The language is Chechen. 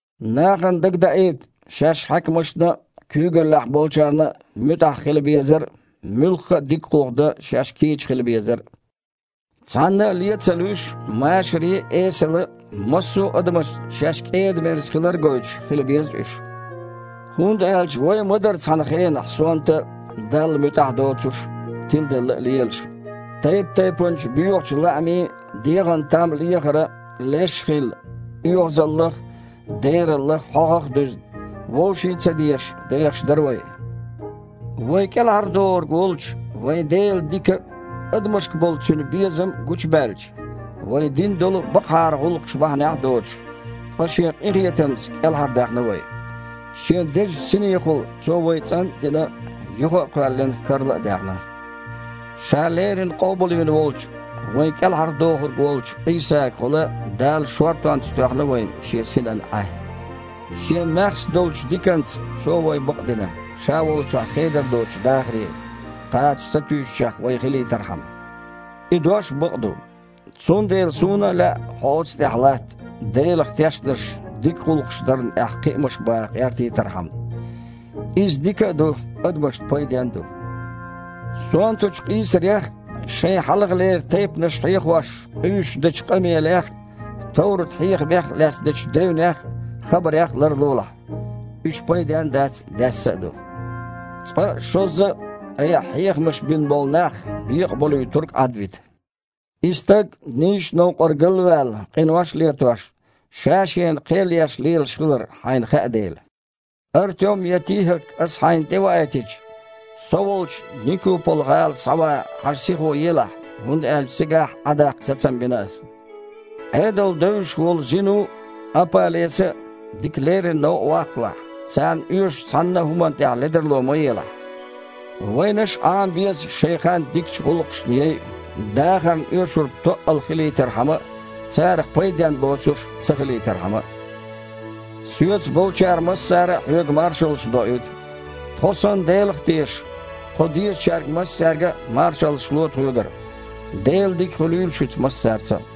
Нахана дагадаийта шаьш хьаькамашна а, куьйгаллехь болчарна а муьтІахь хила безар а, муьлхха а дика гІуллакх дан шаьш кийча хила безар а. Цхьанна а ле а ца луьйш, машаре а, эсала а, массо а адамашца шаьш кІеда-мерза хилар а гойтуш, хила беза уьш. ХІунда аьлча вай а ма дара цхьана хенахь сонта а, Далла муьтІахь доцуш а, тиладелла а лелаш. Тайп-тайпанчу боьхачу лаамийн а, дегІана там лехаран а леш а хилла, оьгІазаллах а, дераллах а, хьогІах а дуьзна, вовшийн а ца дезаш, дехаш дара вай. Вай КІелхьардохург волчу вайн Делан дика а, адамашка болу Цуьнан безам а гучубаьлча, вай дина долу бакъахьара гІуллакхаш бахьанехь а доцуш, ткъа Шен къинхетамца кІелхьардаьхна вай. Шен Дезачу Синехула Цо вай цІан а дина, юха а кхоьллина, карла а даьхна. Ша леррина къобалвина волчу, вайн КІелхьардохург волчу Іийсагахула Дала шортонца тоьхна вайна Шен Синан Іаь. Шен маьхза долчу диканца Цо вай бакъдина, Ша волчохь хедар доцучу дахаре кхача сатуьйсучех вай хилийтархьама. И дош бакъ ду. Цундела суна а лаьа оцу тІехь хьо латта, Делах тешнарш дика гІуллакхаш дарна тІехь кхиамаш баха гІертийтархьама. Иза дика а ду, адамашна пайден а ду. Сонтачу къийсарех а, шайн хьалхалера тайпанаш хьехош къуьйсуш дечу къамелех а, товрат-хьехамех лаьцна дечу девнех а, хабарех а ларлолахь. Уьш пайден а дац, даьсса а ду. Цкъа а, шозза а айхьа хьехамаш бина болу нах бекъаболуьйтург Іадвита, и стаг, нийсачу новкъара гал а ваьлла, къинош а летош, ша-шена кхел еш лелаш хилар хьайна хаьа дела. Артем я ТихІак аса хьайна тІеваийтича, со волчу Никупола-гІала схьаван хьажа сихо елахь, хІунда аьлча цигахь Іа даккха сацам бина аса. Іедал девзаш волу Зину а, Апа-Леса а дика леррина новкъа ваккхалахь. Царна оьшучу цхьанна а хІуманна тІехь ледарло ма елахь. Вайнаш а Іама беза шайн хан дикачу гІуллакхашна яйа, дахарна оьшург тоъал хилийтархьама а, царах пайденна боцурш ца хилийтархьама а. Соьца болчара массара а хьоьга маршаллаш доуьйту. Тхо санна Делах а тешаш, тхо дезачаьрга массаьрга а маршаллаш ло тхоьгара. Делан дика хуьлийла шуьца массаьрца а.